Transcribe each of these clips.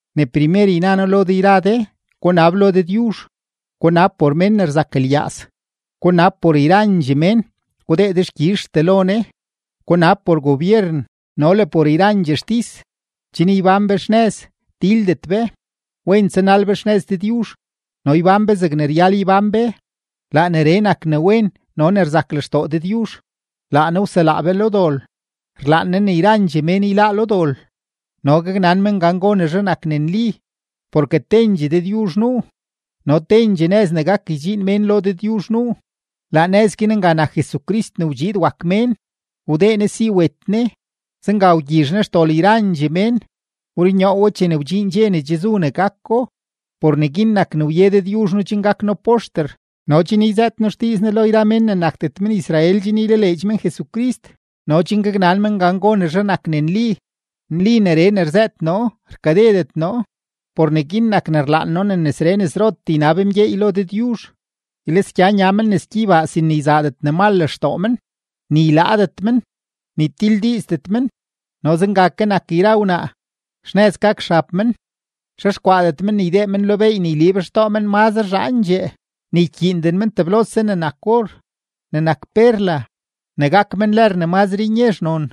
Ne primer yna noo lo de yra de, gunab lo Dëdyuzh, gunab por mén ne rzak lyaaz, gunab por yrandxee mén, gudee dexkyizhtee lo Ne. Gunab por gobyeren no le por yrandxee xtis, chen ybán be xnëz, tildet be, wen tsanal be xnëz Dëdyuzh, no ybán be zegne ryal ybán be. Laa neree nak ne wen no ne rzak lextoo Dëdyuzh. Laa Ne wselaa be lo dol. Rlaan Ne ne yrandxee mén yláá lo dol no gaknan men gan gonezhe nak ne nli. Porke tendxee Dëdyuzh nuu, no tendxee nëz ne gak ydxiin mén lo Dëdyuzh nuu; laa nëz guin nga nak Jesucrist ne wdxiid wak mén. Wdee Ne si wet Ne, zenga wgyizh Ne xdol yrandxee mén; wrunyoo we chene wdxiin dxe ne che zu ne gako. Por neguin nak ne wye Dëdyuzh noo chen gak noo poxter no chen yzëët noo xdiiz Ne lo yra mén ne nakdet men-Israel chen ylaleedx men Jesucrist no chen gaknan men gan gonezhe nak ne nli. Nli neree ne rzëët noo, rkadedet noo. Por neguin nak ne rlaan noo ne nesree nesrotee ynab mgyeey lo Dëdyuzh, ylisgya nya men nes gyeybaa sin ne yzaadet ne mal lextoo men, ni ylaadet men, ni tildiizdet men. No zenga ke nak yra wnaa, xnëz gak xab men, xexkwaadet men ne ydee men lo beey ne yliib xtoo men mazre zhaandxee, ni ykyiinden men teblose ne nak or, ne nak perla, ne gak men lër ne mazre nyezh non.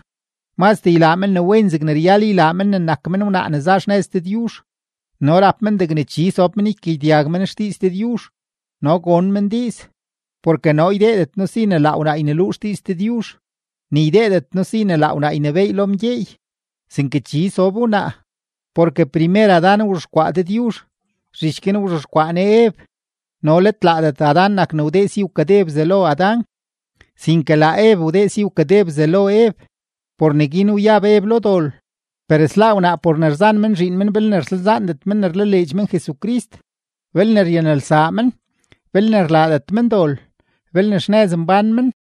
Mazdee ylaa men ne wen zegne ryal ylaa men ne nak men wnaa ne za xnëz Dëdyuzh. No rap men degne chi sob men ykagyedyag men xdiiz Dëdyuzh no gon men diiz. Porke noo ydeedet noo si ne laa wnaa yneluu xdiiz Dëdyuzh, ni ydeedet noo si ne laa wnaa ynebééy lo mgyeey, sinke chi sob wnaa. Porke primer Adán wzhexkwaa Dëdyuzh, zhich guin wzhexkwaa Ne Ev; no let laadet Adán nak ne wdee si wkade Bzelo Adán, sinke laa Ev wdee si wkade Bzelo Ev; por neguin wyab Ev lo dol. Per sláá wnaa por ne rzan men zhiin men belne rsalzaandet men ne rlaleedx men Jesucrist, belne ryanelsaa men, belne rlaadet men dol, belne xnëz mbán men.